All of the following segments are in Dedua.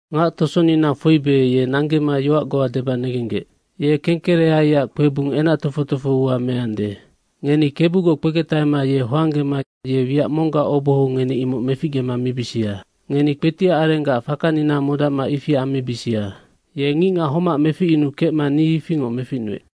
Ngactosonina Foibe, ye nanggema yoac goa deba negenggec. Ye Kengkereaiac kpebung kingang kpeyemmeande. Ngeni Kebugoc kpeketahema ye hoanggema yeng wiac monggac obohou ngeni imoc meficgema mibisia. Ngeni kpetiac arenggac fakanina modacma ifi ammibisia. Ye ngicngac homac meficyunukecma ni ifingoc meficnuec.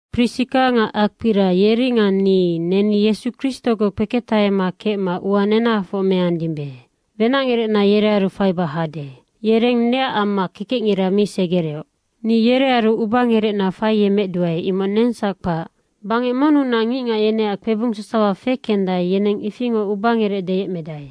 Prisika nga Akpira yeri nga ni, neni Yesu Kristogoc kpeketahema kecma ua nenahafoc meandimbe. Wenacngerecna yerearu faiba hade. Yereng neac amma kekecngira mi segereoc. Ni yerearu ubangerecna faiyecmeduae, imoc nengsac kpac. Bangec monnunac ngicngac, yeneac kpebung sasawa fekendae, yeneng ifingoc ubangerec deyecmedae.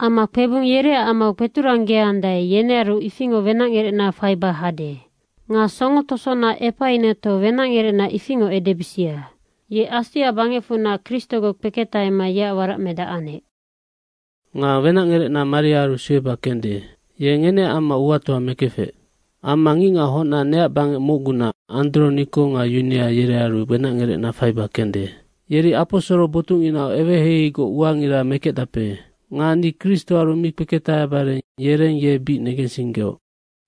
Amma kpebung yereac amau kpeturanggeandae, yenearu ifingoc wenacngerecna faiba hade. Nga songo tosona Epaineto wenacngerecna ifingoc edebisia. Ye Asia bangecfunac Kristogoc kpeketahema yeac waracmedac anec. Nga wenacngerecna Mariaaru sueba kende. Ye ngeneac amma uatoa mekefec. Amma ngicngahocna neac bangec mocguna Androniko nga Yunia yerearu wenacngerecna faiba kende. Yeri aposoro botucnginau eweheiheigoc uangira mekecdape. Nga ni Kristoaru mi kpeketahebare yereng ye bic negensinggeoc.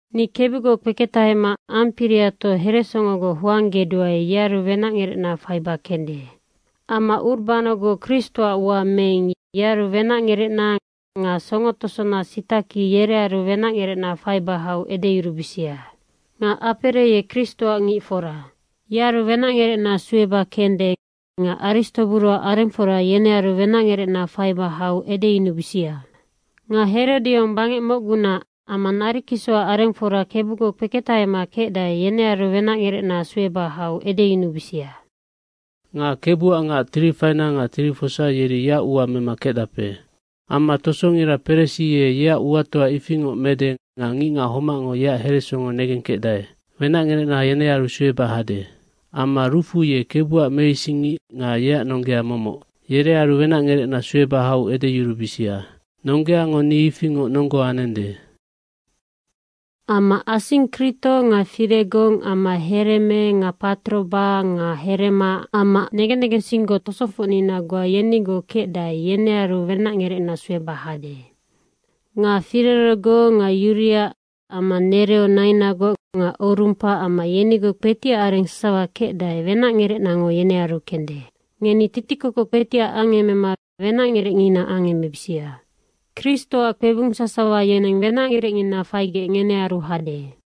Ni Kebugoc kpeketahema Ampiriato heresongogoc hoanggeduae, yearu wenacngerecna faiba kende. Amma Urbanogoc Kristoac ua meing, yearu wenacngerecna nga songo tosona Sitaki yerearu wenacngerecna faiba hau edeyurubisia. Nga Apere ye Kristoac ngic fora, yearu wenacngerecna sueba kende nga Aristoburoac arengfora yenearu wenacngerecna faiba hau edeyunubisia. Nga Herodiong bangec mocguna amma Narikisoac arengfora Kebugoc kpeketahema kecdae, yenearu wenacngerecna sueba hau edeyunubisia. Nga Kebuac ngac Tirifaina nga Tirifosa, yeri yeac ua mema kecdape. Amma tosongira Peresi ye yeac uatoa ifingoc mede nga ngicngac homacngo yeac heresongo negengkecdae. Wenacngerecna yenearu sueba hade. Amma Rufu ye Kebuac meising ngic nga yeac nonggea momoc, yerearu wenacngerecna sueba hau edeyurubisia. Nonggeango ni ifingoc nonggo anende. Amma Asingkrito nga Firegong amma Hereme nga Patoroba nga Herema amma negen negensinggoc tosofocnina goa yenigoc kecdae, yenearu wenacngerecna sueba hade. Nga Firorogo nga Yuria amma Nereo nainagoc nga Orumpa amma yenigoc kpetiac areng sasawa kecdae, wenacngerecnango yenearu kende. Ngeni titikokoc kpetiac angemema wenacngerecngina angemebisia. Kristoac kpebung sasawa, yeneng wenacngerecngina faigec ngenearu hade.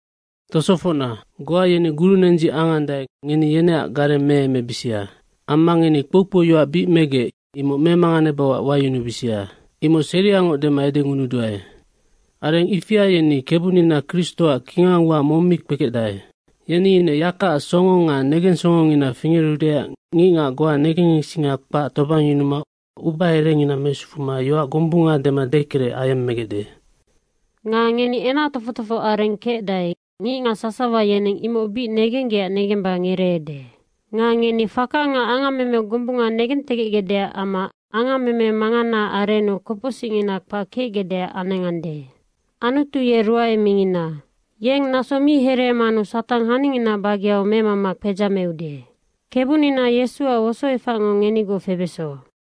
Tosofocna, goa yeni gurunendzic angandae, ngeni yeneac gareng meemebisia. Amma ngeni kpoukpouyoac bic megec, imoc memanganebauac wayunubisia. Imoc seriangoc dema edengunuduae. Areng ifia yeni Kebunina Kristoac kingang ua mong mi kpekecdae. Yeni ine yakaac songo nga negensongongina fingerudeac ngicngac goa negengisinga kpac tobangyunuma ubaherengina mesufuma yoac gombunga dema dekerec ayemmegecde. Nga ngeni enac tofoc tofoho areng kecdae, ngicngac sasawa yeneng imoc bic negenggecac negemba ngereede. Nga ngeni faka nga angammeme gombunga negentegecgecdeac amma angammeme manganaac arennu kopocsicngina kpac kecgecdeac anengande. Anutu, ye ruae mingina. Yeng naso mi hereemanu Satang haningina bageau memama kpedzameude. Kebunina Yesuac wosoefacngo ngenigoc febeso.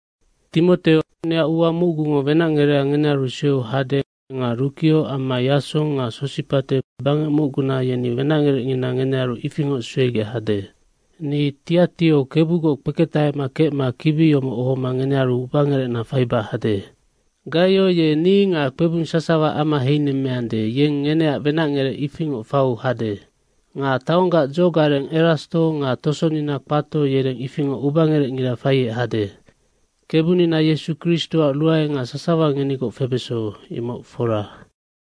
Timoteo, neac ua mocgungo wenacngereha ngenearu sueu hade nga Rukio amma Yasong nga Sosipate bangec mocguna, yeni wenacngerecngina ngenearu ifingoc suegec hade. Ni Teatio, Kebugoc kpeketahema kecma kibi yomoc ohoma ngenearu ubangerecna faiba hade. Gaio, ye ni nga kpebung sasawa ama heinemmeande, yeng ngeneac wenacngerec ifingoc faiu hade. Nga taonggac dzo gareng Erasto nga tosonina Kpato, yereng ifingoc ubangerecngira faiec hade. Kebunina Yesu Kristoac ruaengo sasawa ngenigoc febeso. Imoc Fora.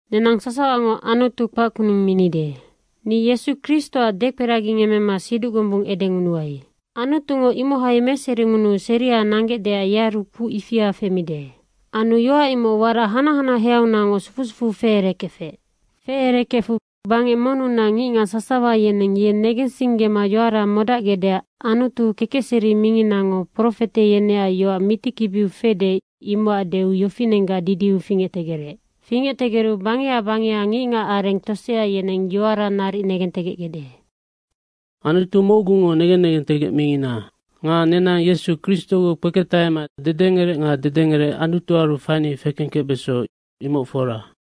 Nenang sasawango Anutu kpackuneng minide. Ni Yesu Kristoac dekperagingemmema siduc gombung edengunuai. Anutungo imohainoc meseringunuu seria nanggecdeac yearu kuc ifia femide. Anu yoac imoc warac hanac hanaheaunacngoc sufu sufuu feerekefec. Feerekefu bangec monnunac ngicngac sasawa, yeneng ye negensinggema yoara modacgecdeac Anutu kekecseri minginango profete yeneac yoac mitikibiu fede, imocac deu yofinenggac didiu fingectegerec. Fingectegeru bangeha bangeha ngicngac areng tosea yeneng yoara naric negentegecgecde. Anutu mocgungo negen negentegec mingina. Nga nenang Yesu Kristogoc kpeketahema dedengerec nga dedengerec Anutuaru faini fekengkecbeso, imoc fora.